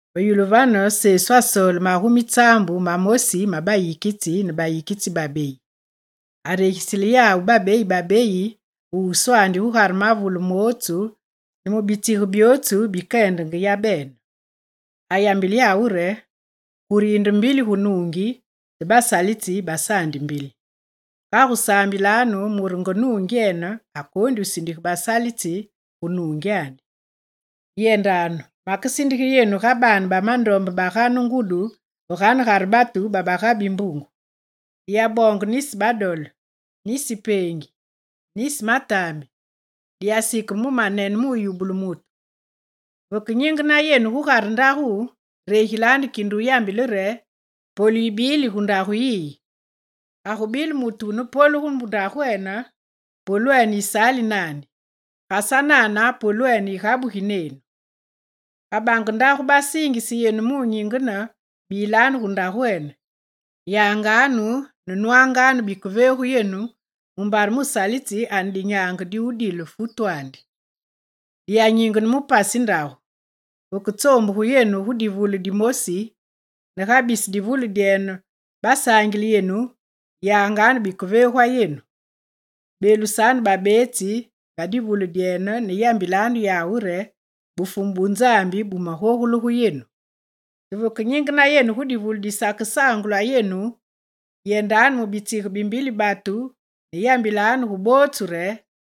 Ve yulu vane Fumu asoole magumi tsaambu mamosi ma bayikitsi ne bayikitsi babeyi. Aregisile yawu babeyi babeyi ve wuswandi gugare mavule mootsu ne mu bitsige byootsu bikeyendenge yabene. Ayambile yawu re: «Kure yinde mbili gu nuungi te basalitsi basaandi mbili. Kagu saambilanu mure nge nuungyene akoondi wusindige basalitsi gu nuungyandi. Yendanu, makesindige yenu ga baane ba mandombe bagane ngudi ve ganegare batu baba ga bimbungu. Diyaboonge nisi badole, nisi peengi, nisi mataambi, diyasikeme mu manene muyubule mutu. Vekenyingene yenu gugare ndagu, regilanu kinde wuyambile re: “Polu yibili gu ndagu yiyi.” Ga gubile mutu wune polu gu ndagwene, polwenu yisaali naandi, ga sanana polwenu yigabugi nenu. Ga bange ndagu basiingise yenu munyingene, bilanu gu ndagwene. Yanganu ne nwanganu bikeveegu yenu mumbare musalitsi ane dinyaange mudile futwandi. Diya nyingene mu pasi bandagu. Veketsoombugungu yenu gu divule dimoosi, ne ga bisi divule dyene basaangile yenu, yanganu bikeveegwa yenu. Beelusanu babeetsi ba divule dyene ne yambilanu yawu re: “Bufumu bu Nzambi bumagogule gu yenu.” Te vekenyingena yenu gu divule disakesaangulwa yenu, yendanu mu bitsige bi mbili batu ne yambilanu gu bootsu re: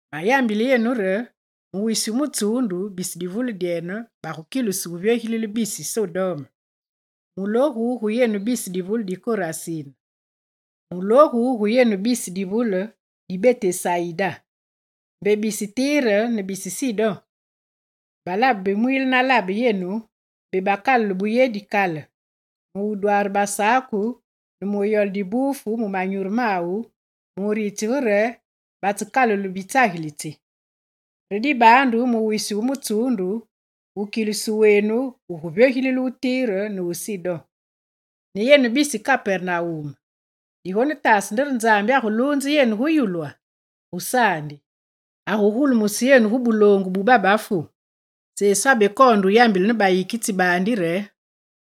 Mayambile yenu: Mu wisi wu mutsuundu bisi divule dyene bagukilusu wuvyogilile bisi Sodome!» «Mulogu gu yenu bisi divule di Korasin, mulogu gu yenu bisi divule di Betesayida! Mbe bisi Tire ne bisi Sidon balabe bimwiile na labe yenu, mbe bakalule buyedi kale mudwaare basaku ne muyole dibuufu mu manyuru mawu, muritsige re batsekalule bitsagilitsi. Re dibaandu mu wisi wu mutsuundu, wukilusu wenu wuguvyogilile wu Tire ne Sidon. Ne yenu bisi Kapernawum, digonetaase nde re Nzambi aguluunze yenu gu yulwa? Gusaandi, agugulumuse yenu gu buloongu bu babafu.» Sesu abekoonde yambile bayikitsi baandi re: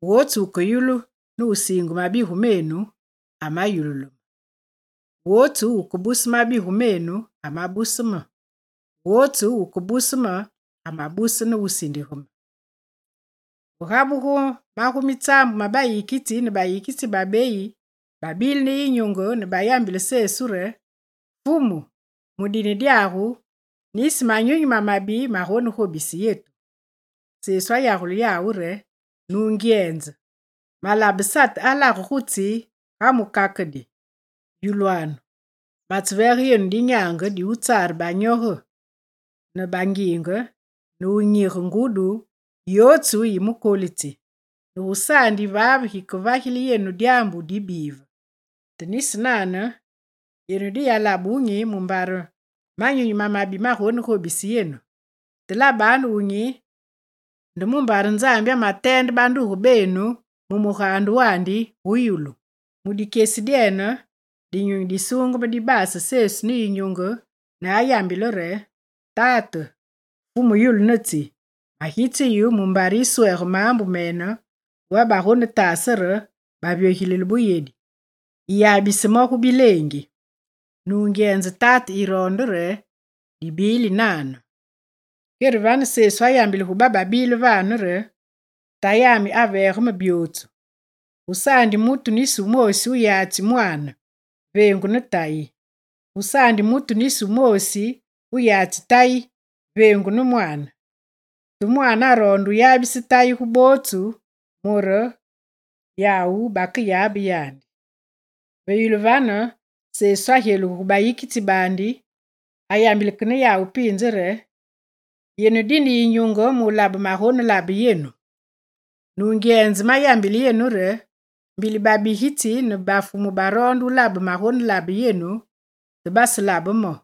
«Wotsu wukeyulu ne wusiinge mabigu menu, amayululu me; wotsu wukebuse mabigu menu amabuse me; wotsu wukebuse me amabuse ne wusindige me.» Ve gabugu magumi tsaambu ma bayikitsi ne bayikitsi babeyi babile ne yinyunge ne bayambile Sesu re: «Fumu, mu dine dyagu nisi manyunyi mamabi magonegobise yetu.» Sesu ayagule yawu re: «Nungyenze, malabe Sate alage gu tsi ga mukakedi. Yulwanu: matseveege yenu dinyaange di wutsaare banyoge ne bangiinge ne wunyige ngudi yotsu yi mukolitsi, ne gusaandi yivaave gikevagile yenu dyaambu dibive. Te nisi nane, yenu diyalabe yinyunge mumbare manyunyi mamabi magonegobise yenu, te labanu yinyunge nde mumbare Nzambi amateende banduge benu mu mugaande wandi gu yulu.» Mu dikyesi dyene Dinyunyi Disuungeme dibase Sesu ne yinyunge ne ayambile re: «Tate, Fumu yulu ne tsi, magitse yu mumbare yiswege maambu mene gu babagonetaase re bavyogilile buyedi, yiyabise mo gu bileengi. Nungyenze Tate yiroonde re dibili nane.» Kere vane Sesu ayambile gu bababile vane re: «Tayami aveege me byootsu. Gusaandi mutu nisi wumoosi wuyatsi Mwaane, veengu ne Tayi, gusaandi mutu nisi wumoosi wuyatsi Tayi veengu ne Mwaane. Te Mwaane aroonde wuyabise Tayi gu bootsu mure ne yawu bakeyabe yandi.» Ve yulu vane Sesu agyelugu gu bayikitsi baandi, ayambile ke ne yawu piinze re: «Yenu dine yinyunge mulabe magonelabe yenu! Nungyenze mayambile yenu re: mbili babigitsi ne bafumu baroonde wulabe magonelabe yenu, te baselabe mo.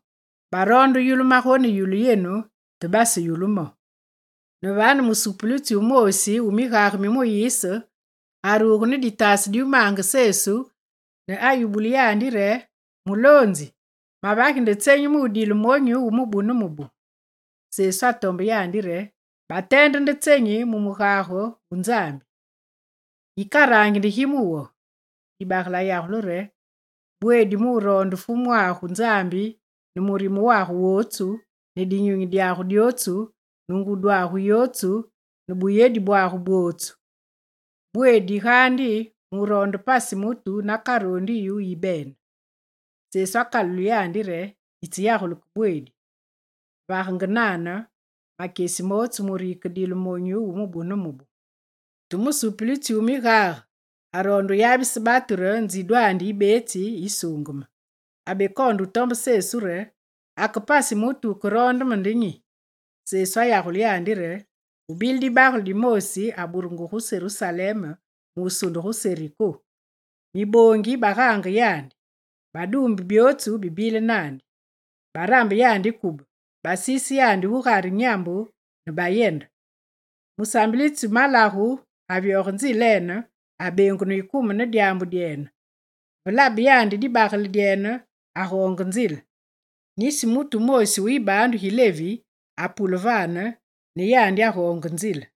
Baroonde wuyulu magoneyulu yenu te baseyulu mo!» Ne vane musupulitsi wumoosi wu migage mi Muyise aruge ne ditaase di wumaange Sesu, ne ayubule yandi re: «Muloonzi, mavagi nde tsenyi mudile monyu wu mubu ne mubu?» Sesu atombe yandi re: «Bateende nde tsenyi mu mugage wu Nzambi? Yikarangi nde gi mu wo?» Dibagele ayagule re: «“Bweedi muroonde Fumwagu Nzambi ne murime wagu wotsu, ne dinyunyi dyagu dyotsu, ne ngudyagu yotsu, ne buyedi bwagu bwotsu. Bweedi gaandi muroonde pasi mutu nakaroondi yu yibene.”» Sesu akalulile yandi re: «Yitseyagule ke bweedi. Vagenge nane makyesi mootsu yikedile monyu wu mubu ne mubu.» Te musupulitsi wu migage aroonde wuyabise batu re nzidwandi yibetsi yisuungeme. Abekoonde wutombe Sesu re: «Ake pasi mutu wukeroonde me nde nyi?» Sesu ayagule yandi re: «Gubile dibagele dimoosi aburugu gu Serusalem musunde gu Seriko. Miboongi migaange yandi. Baduumbe byootsu bibile naandi, barambe yandi kube, basiise yandi gugare nyambu ne bayende. Musaambilitsi malagu avyoge nzilene; abeengunu yikume ne dyaambu dyene. Ve laba yandi dibagele dyene, agoonge nzile. Nisi mutu wumoosi wu yibaandu gi Levi apule vane ne yandi agoonge nzile.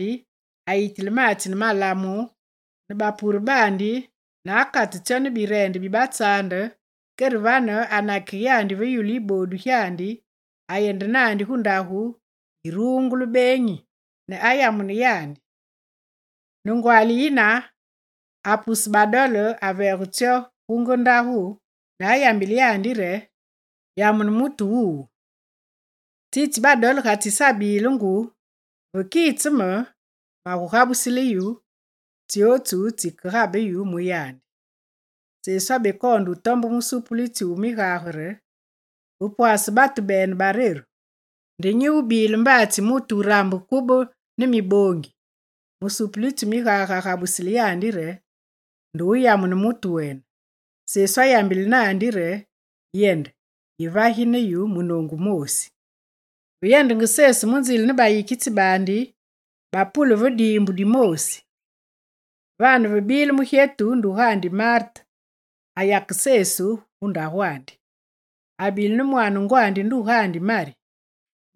Kere agogule neve yandi, ayitile maatsi ne malamu mu wubuge bapure baandi ne akate tsyo ne bireende bibatsaande kere vane anakige yandi ve yulu yiboodu gyandi, ayende naandi gu ndagu yi ruungulu beenyi, ne ayamune yandi. Ne ngwaali yine, apuse badole, aveege tsyo gu nge ndagu ne ayambile yandi re: “Yamune mutu wuwu. Tsitsi badole gatsisabile ngu, vekitse me, magugabusile yu tsyotsu tsikegabe yu mu yandi.”» Sesu abekoonde wutombe musupulitsi wu migage re: «Ve pwase batu bene bareru, nde nyi wubile mbaatsi mutu wurambu kube ne miboongi?» Musupulitsi wu migage agabusile yandi re: «Nde wuyamune mutu wene.» Sesu ayambile naandi re: «Yende, yevagi ne yu munoongu wumoosi!» Ve yendenge Sesu mu nzile ne bayikitsi baandi, bapule ve diimbu dimoosi. Vane vebile mugyetu ndugandi Marte ayake Sesu gu ndagwandi. Abile ne mwaane ngwandi, ndugandi Mari.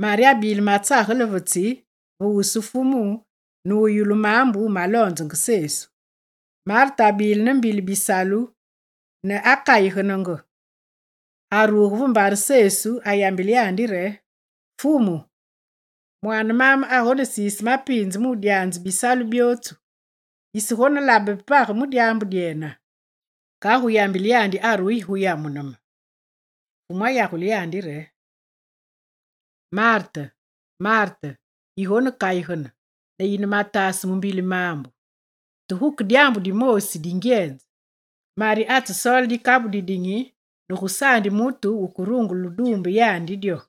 Mari abile matsagele ve tsi ve wusu Fumu ne ayulungu maambu maloonzenge Sesu. Marte abile ne mbili bisalu ne akayigenenge. Aruge ve mbare Sesu, ayambile yandi re: «Fumu, mwaane maame agonesiise mapiinze mudyanze bisalu byootsu, yisegonelabe page mu dyaambu dyena? Kagu yambile yandi arugi gu yamune me.» Fumu ayagule yandi re: «Marte, Marte, yigonekayigene ne yine mataase mu mbili maambu, te guke dyaambu dimoosi dingyenze. Mari atsesoole dikabu didinyi ne gusaandi mutu wukerungule wuduumbe ya dyo.»